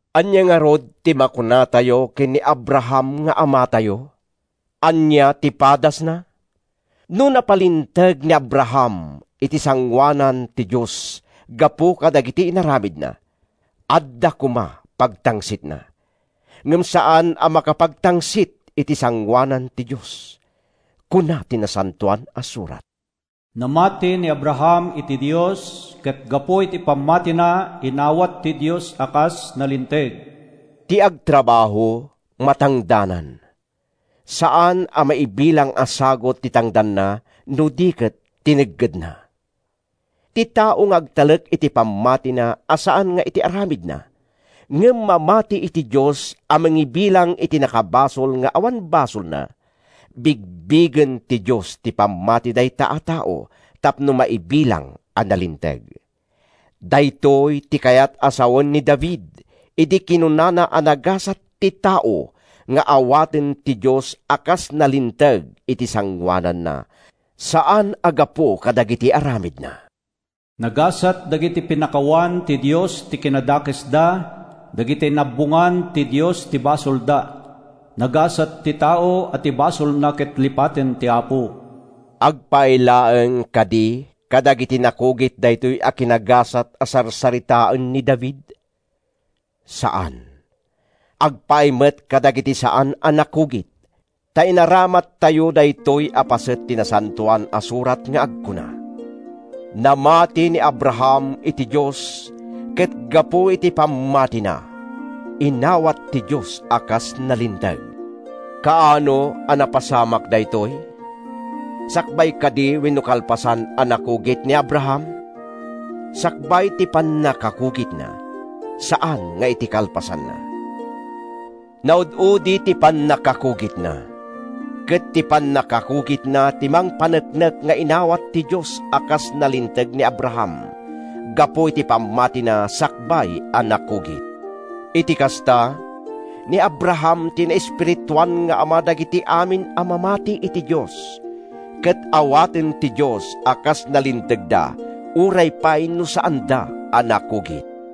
Ania ngarud ti makunatayo ken ni Abraham nga amatayo? Ania ti padasna? No napalinteg ni Abraham iti sangoanan ti Dios gapu kadagiti inaramidna, adda koma pagtangsitna. Ngem saan a makapagtangsit iti sangoanan ti Dios. Kuna ti Nasantoan a Surat, “Namati ni Abraham iti Dios, ket gapu iti pammatina, inawat ti Dios a kas nalinteg.” Ti agtrabaho, matangdanan. Saan a maibilang a sagut ti tangdanna no di ket tineggedna. Ti tao nga agtalek iti pammatina a saan nga iti aramidna, ngem mamati iti Dios a mangibilang iti nakabasol nga awan basolna, bigbigen ti Dios ti pammati dayta a tao tapno maibilang a nalinteg. Daytoy ti kayat a sawen ni David idi kinunana a nagasat ti tao nga awaten ti Dios a kas nalinteg iti sangoananna, saan a gapu kadagiti aramidna: “Nagasat dagiti pinakawan ti Dios ti kinadakesda, dagiti inabbongan ti Dios ti basolda! Nagasat ti tao a ti basolna ket lipaten ti Apo!” Agpaay laeng kadi kadagiti nakugit daytoy a kinagasat a sarsaritaen ni David? Saan! Agpaay met kadagiti saan a nakugit. Ta inaramattayo daytoy a paset ti Nasantoan a Surat nga agkuna: “Namati ni Abraham iti Dios, ket gapu iti pammatina, inawat ti Dios a kas nalinteg.” Kaano a napasamak daytoy? Sakbay kadi wenno kalpasan a nakugit ni Abraham? Sakbay ti pannakakugitna, saan nga iti kalpasanna. Naud-udi ti pannakakugitna, ket ti pannakakugitna ti mangpaneknek nga inawat ti Dios a kas nalinteg ni Abraham gapu iti pammatina sakbay a nakugit. Iti kasta, ni Abraham ti naespirituan nga ama dagiti amin a mamati iti Dios, ket awaten ti Dios a kas nalintegda uray pay no saanda a nakugit.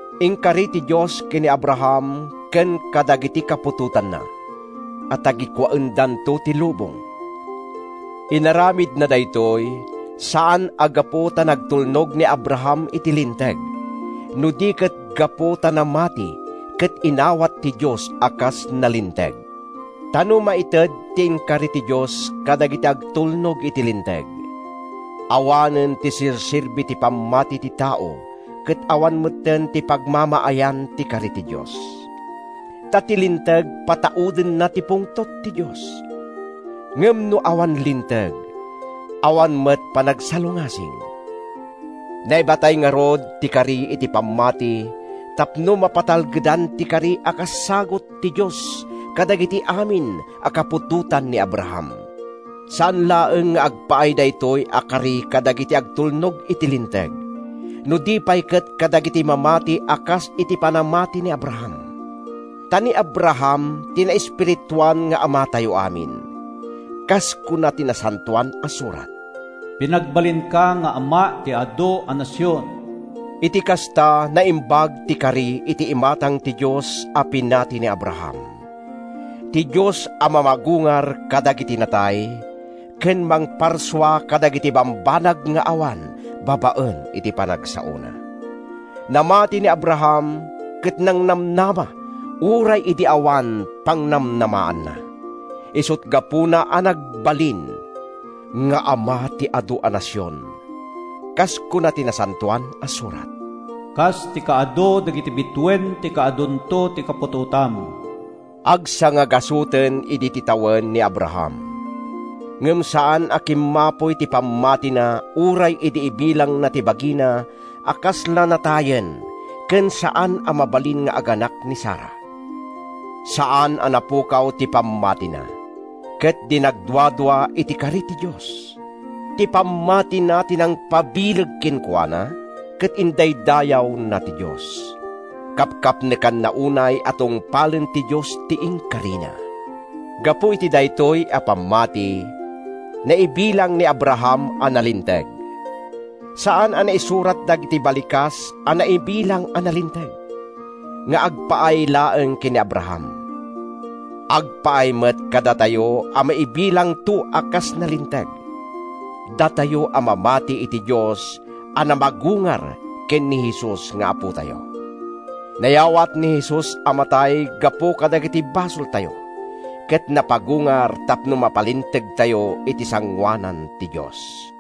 Inkari ti Dios ken ni Abraham ken kadagiti kaputotanna a tagikuaendanto ti lubong. Inaramidna daytoy, saan a gapu ta nagtulnog ni Abraham iti Linteg, no di ket gapu ta namati ket inawat ti Dios a kas nalinteg. Ta no maited ti inkari ti Dios kadagiti agtulnog iti Linteg, awanen ti serserbi ti pammati ti tao ket awan metten ti pagmamaayan ti kari ti Dios. Ta ti Linteg pataudenna ti pungtot ti Dios. Ngem no awan linteg, awan met panagsalungasing. Naibatay ngarud ti kari iti pammati tapno mapatalgedan ti kari a kas sagut ti Dios kadagiti amin a kaputotan ni Abraham. Saan laeng nga agpaay daytoy a kari kadagiti agtulnog iti Linteg, no di pay ket kadagiti mamati a kas iti panamati ni Abraham. Ta ni Abraham ti naespirituan nga amatayo amin. Kas kuna ti Nasantoan a Surat, “Pinagbalinka nga ama ti adu a nasion.” Iti kasta, naimbag ti kari iti imatang ti Dios a pinati ni Abraham, ti Dios a mamagungar kadagiti natay ken mangparsua kadagiti bambanag nga awan babaen iti panagsaona. Namati ni Abraham ket nangnamnama uray idi awan pangnamnamaanna. Isut’ gapuna a nagbalin “nga ama ti adu a nasion.” Kas kuna ti Nasantoan a Surat, “Kas ti kaadu dagiti bituen ti kaadunto ti kaputotam.” Agsangagasuten idi ti tawen ni Abraham. Ngem saan a kimmapuy ti pammatina uray idi ibilangna ti bagina a kasla natayen ken saan a mabalin nga aganak ni Sara. Saan a napukaw ti pammatina, ket di nagduadua iti kari ti Dios. Ti pammatina ti nangpabileg kenkuana ket indaydayawna ti Dios. Kapkapnekanna unay a tungpalen ti Dios ti inkarina. Gapu iti daytoy a pammati, naibilang ni Abraham a nalinteg. Saan a naisurat dagiti balikas a “naibilang a nalinteg” nga agpaay laeng ken ni Abraham. Agpaay met kadatayo a maibilangto a kas nalinteg, datayo a mamati iti Dios a namagungar ken ni Jesus nga Apotayo. Nayawat ni Jesus a matay gapu kadagiti basoltayo, ket napagungar tapno mapalintegtayo iti sangoanan ti Dios.